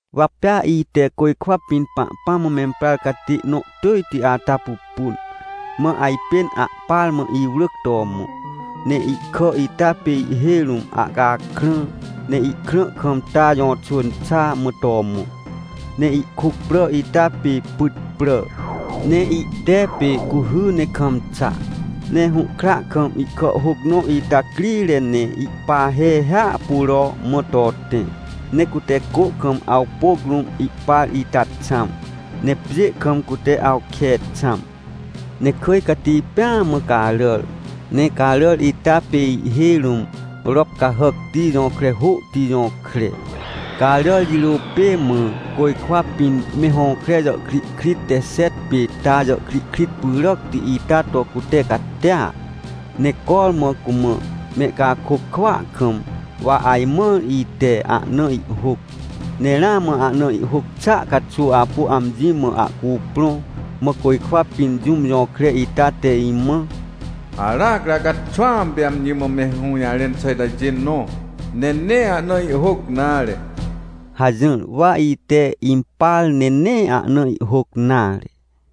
Wa pea ite côjkwa pĩn Pahpãm mã memprar catê nõ tỳjti ata pupun, mã ajpên ahpar mã iwrỳc to mõ. Ne ihkà ita pê ihhêj rũm ahcakrã, ne ihkrã kam ta jõxwỳn xa, mã to mõ. Ne ihkuc prà ita pê pyt prà. Ne ihte pê cuhy ne kam xa. Ne hũhkra kam ihkàhhôc nõ ita crire ne ihpahe hiahpuro mã to tẽ. Ne cute cô kam awpôc rũm ihpar ita xãm, ne pjê kam cute awke xãm. Ne kỳj cati pêa mã caràr, ne caràr ita pê ihhêj rũm rop cahàcti jõkre hôhti jõkre. Caràr jirô pê mã côjkwa pĩn me hõkre jàhkrihkrit te xet pê ta jàhkrihkrit pyràcti ita to cute catia. Ne cormã cumã mehcakôc kwỳa kam, wa ajmãr ite ahna ihhôc, ne ramã ahna ihhôc xàa caxuw apu amji mã ahcuprõ, mã côjkwa pĩn jũm jõkre ita te imã: — Aracri acaxwãm pê amji mã me hũjarẽn xà itajê nõ, ne nee ahna ihhôc nare — hajỹr. Wa ite impar, ne nee ahna ihhôc nare.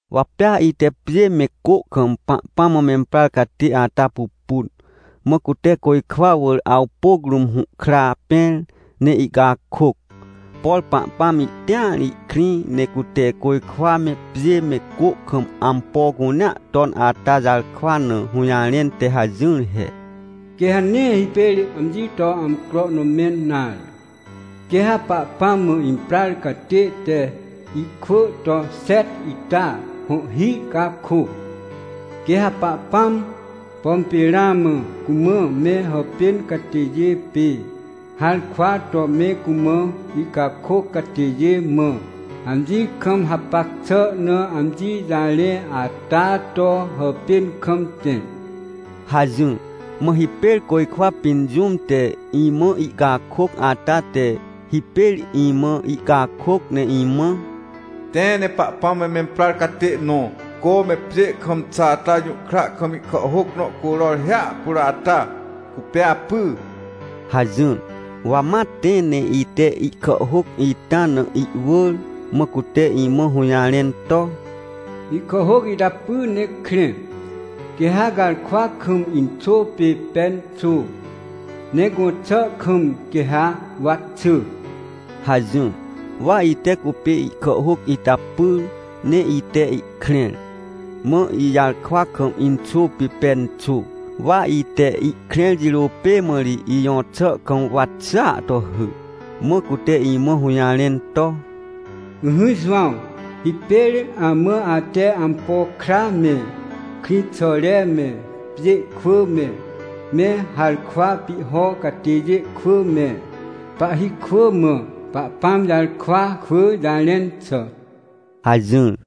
Wa pea ite pjê me cô kam Pahpãm mã memprar catê ata pupun, mã cute côjkwa wỳr awpôc rũm hũhkra pẽr, ne ihcakôc. Por Pahpãm ihtĩar ihkrĩ ne cute côjkwa me, pjê me, cô kam ampo cunea ton ata jarkwa na hũjarẽn te hajỹr he: — Quê ha nee hipêr amji to amcro nõ mẽn nare! Quê ha Pahpãm mã imprar catê te ihkwỳ to xet ita hõhhi cakô. Quê ha Pahpãm, pom pê ramã cumã me hàpên catêjê pê harkwa to me cumã ihcakôc catêjê mã, amji kam hapac xà na amji jarẽ ata to hàpên kam tẽ — hajỹr. Mã hipêr côjkwa pĩn jũm te imã ihcakôc ata te hipêr imã ihcakôc ne imã: — Tẽ ne Pahpãm mã memprar catê nõ, cô me pjê kam xa ata jũhkra kam ihkàhhôc nõ curor hiahpuro ata, cupê apy — hajỹr. Wa ma tẽ ne ite ihkàhhôc ita na ihwỳr. Mã cute imã hũjarẽn to: — Ihkàhhôc ita py ne krẽ, quê ha garkwa kam inxô pê pen xô, ne gõxà kam quê ha wa xỳ — hajỹr. Wa ite cupê ihkàhhôc ita pyr, ne ite ihkrẽr. Mã ijarkwa kam inxô pê pen xô, wa ite ihkrẽr jirô pê mã ri ijõxà kam, wa xỳa to hỳ. Mã cute imã hũjarẽn to: — Ỹhỹ Jowãw, hipêr amã ate ampo kra me, krĩxàre me, pjê kwỳ me, me harkwa pihho catêjê kwỳ me, pahhi kwỳ mã Pahpãm jarkwa kwỳ jarẽn xà — hajỹr.